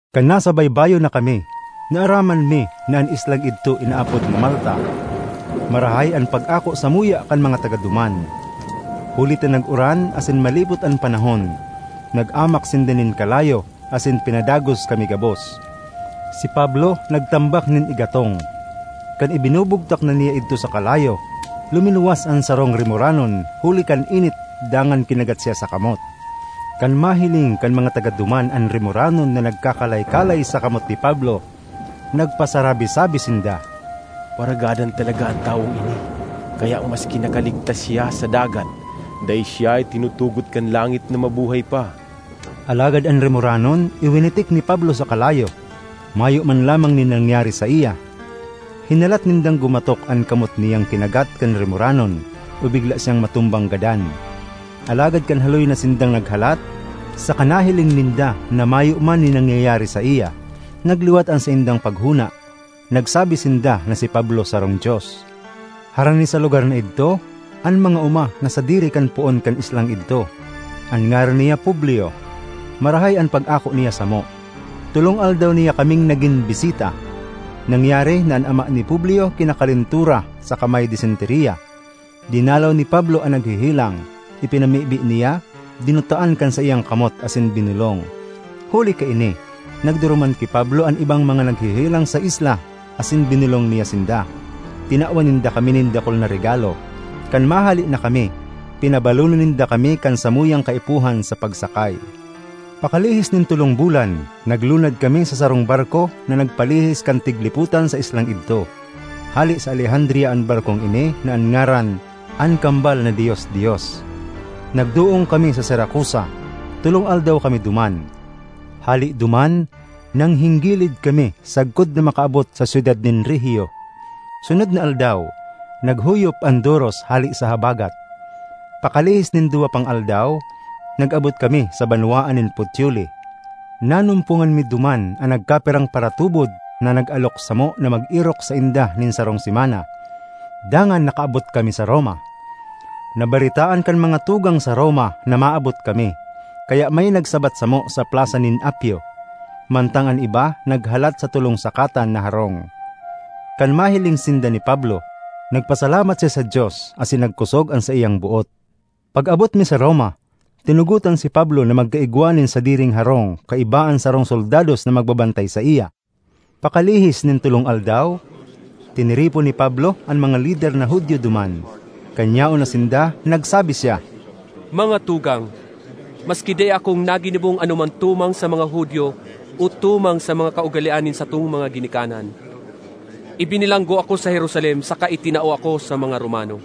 Kan nasa baybayon na kami, naaraman mi na an islang idto inaapod na Malta. Marahay an pag-ako samuya kan mga taga duman. Huli ta nag-uran asin malipot an panahon, nag-amak sinda nin kalayo asin pinadagos kami gabos. Si Pablo nagtambak nin igatong. Kan ibinubugtak na niya idto sa kalayo, luminuwas an sarong rimoranon huli kan init dangan kinagat siya sa kamot. Kan mahiling kan mga taga duman an rimoranon na nagkakalay-kalay sa kamot ni Pablo, nagpasarabi-sabi sinda, “Paragadan talaga an tawong ini, kaya maski nakaligtas siya sa dagat, dai siya itinutugot kan langit na mabuhay pa.” Alagad an rimoranon iwinitik ni Pablo sa kalayo; mayo man lamang nin nangyari saiya. Hinalat nindang gumatok an kamot niyang kinagat kan rimoranon o bigla siyang matumbang gadan. Alagad kan haloy na sindang naghalat, saka nahiling ninda na mayo man nin nangyayari saiya, nagliwat an saindang paghona; nagsabi sinda na si Pablo sarong dios. Harani sa lugar na idto an mga oma na sadiri kan poon kan islang idto; an ngaran niya Publio. Marahay an pag-ako niya samo; tolong aldaw niya kaming nagin bisita. Nangyari na an ama ni Publio kinakalentura saka may disenteriya. Dinalaw ni Pablo an naghehelang, ipinamibi niya, dinutaan kan saiyang kamot asin binolong. Huli kaini nagduruman ki Pablo an ibang mga naghehelang sa isla asin binolong niya sinda. Tinawan ninda kami nin dakul na regalo; kan mahale na kami, pinabalonan ninda kami kan samuyang kaipuhan sa pagsakay. Pakalihis nin tolong bulan, naglunad kami sa sarong barko na nagpalihis kan tiglipotan sa islang idto. Hale sa Alejandria an barkong ini na an ngaran, “An Kambal na Dios-dios.” Nagdoong kami sa Siracusa; tolong aldaw kami duman. Hale duman, nanghinggilid kami sagkod na makaabot sa syudad nin Regio. Sunod na aldaw, naghuyop an doros hale sa habagat; pakalihis nin duwa pang aldaw, nag-abot kami sa banwaan nin Puteoli. Nanumpongan mi duman an nagkapirang paratubod na nag-alok samo na mag-erok sainda nin sarong semana. Dangan nakaabot kami sa Roma. Nabaretaan kan mga tugang sa Roma na maabot kami, kaya may nagsabat samo sa Plasa nin Apio, mantang an iba naghalat sa Tolong Sakatan na Harong. Kan mahiling sinda ni Pablo, nagpasalamat siya sa Dios asin nagkosog an saiyang boot. Pag-abot mi sa Roma, tinugotan si Pablo na magkaigwa nin sadiring harong kaiba an sarong soldados na magbabantay saiya. Pakalihis nin tolong aldaw, tiniripon ni Pablo an mga lider na Judio duman. Kan yaon na sinda, nagsabi siya, “Mga tugang, maski dai akong naginibong anoman tumang sa mga Judio o tumang sa mga kaugalean nin satong mga ginikanan, ibinilanggo ako sa Jerusalem saka itinao ako sa mga Romano.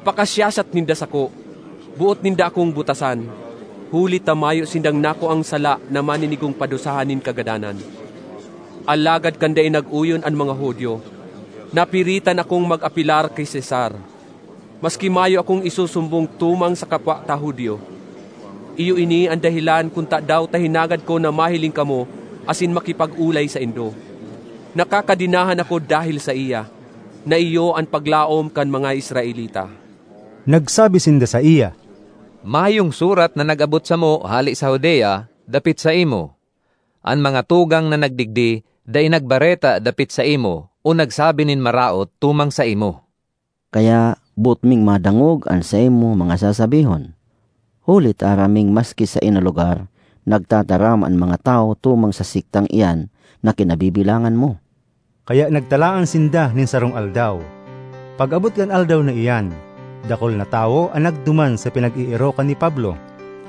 Pakasiyasat ninda sako, boot ninda akong butasan, huli ta mayo sindang nakuang sala na maninigong padusahan nin kagadanan. Alagad kan dai nag-oyon an mga Judio, napiritan akong mag-apelar ki Cesar, maski mayo akong isusumbong tumang sa kapwa ta Judio. Iyo ini an dahelan kun tadaw ta hinagad ko na mahiling kamo asin makipag-olay saindo. Nakakadenahan ako dahel saiya, na iyo an paglaom kan mga Israelita.” Nagsabi sinda saiya, “Mayong surat na nag-abot samo hale sa Judea dapit saimo. An mga tugang na nagdigdi dai nagbareta dapit saimo o nagsabi nin maraot tumang saimo. Kaya boot ming madangog an saimong mga sasabihon, huli ta aram ming maski saen na lugar, nagtataram an mga tawo tumang sa sektang iyan na kinabibilangan mo.” Kaya nagtalaan sinda nin sarong aldaw. Pag-abot kan aldaw na iyan, dakul na tawo an nagduman sa pinag-eerokan ni Pablo.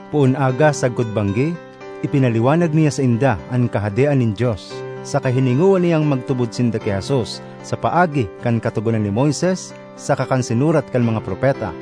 Poon aga sagkod banggi, ipinaliwanag niya sainda an Kahadean nin Dios saka hiningowa niyang magtubod sinda ki Jesus sa paagi kan Katogonan ni Moises saka kan sinurat kan mga propeta.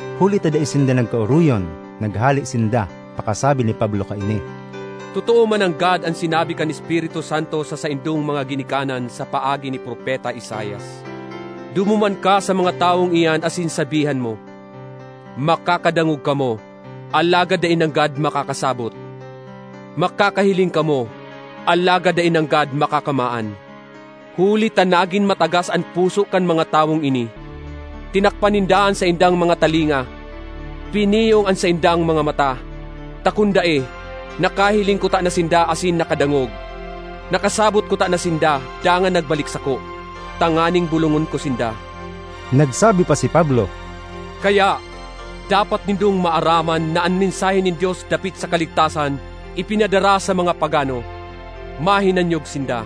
Huli ta dai sinda nagka-oroyon, naghale sinda pakasabi ni Pablo kaini, “Totoo mananggad an sinabi kan Espiritu Santo sa saindong mga ginikanan sa paagi ni Propeta Isaias: ‘Dumuman ka sa mga tawong iyan asin sabihan mo, Makakadangog kamo, alagad dai nanggad makakasabot; makakahiling kamo, alagad dai nanggad makakamaan. Huli ta nagin matagas an puso kan mga tawong ini; tinakpan ninda an saindang mga talinga, piniyong an saindang mga mata. Ta kun dai, nakahiling kutana sinda asin nakadangog; nakasabot kutana sinda, dangan nagbalik sako, tanganing bolongon ko sinda.’” Nagsabi pa si Pablo, “Kaya, dapat nindong maaraman na an mensahe nin Dios dapit sa kaligtasan ipinadara sa mga pagano; mahinanyog sinda!”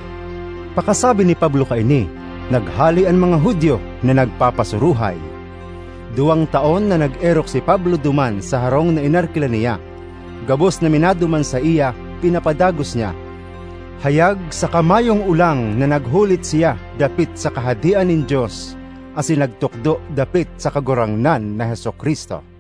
[Pakasabi ni Pablo kaini, naghale an mga Judio na nagpapasuruhay.] Duwang taon na nag-erok si Pablo duman sa harong na inarkila niya. Gabos na minaduman saiya pinapadagos niya. Hayag saka mayong olang na naghulit siya dapit sa Kahadean nin Dios asin nagtukdo dapit sa Kagurangnan na Jesu-Cristo.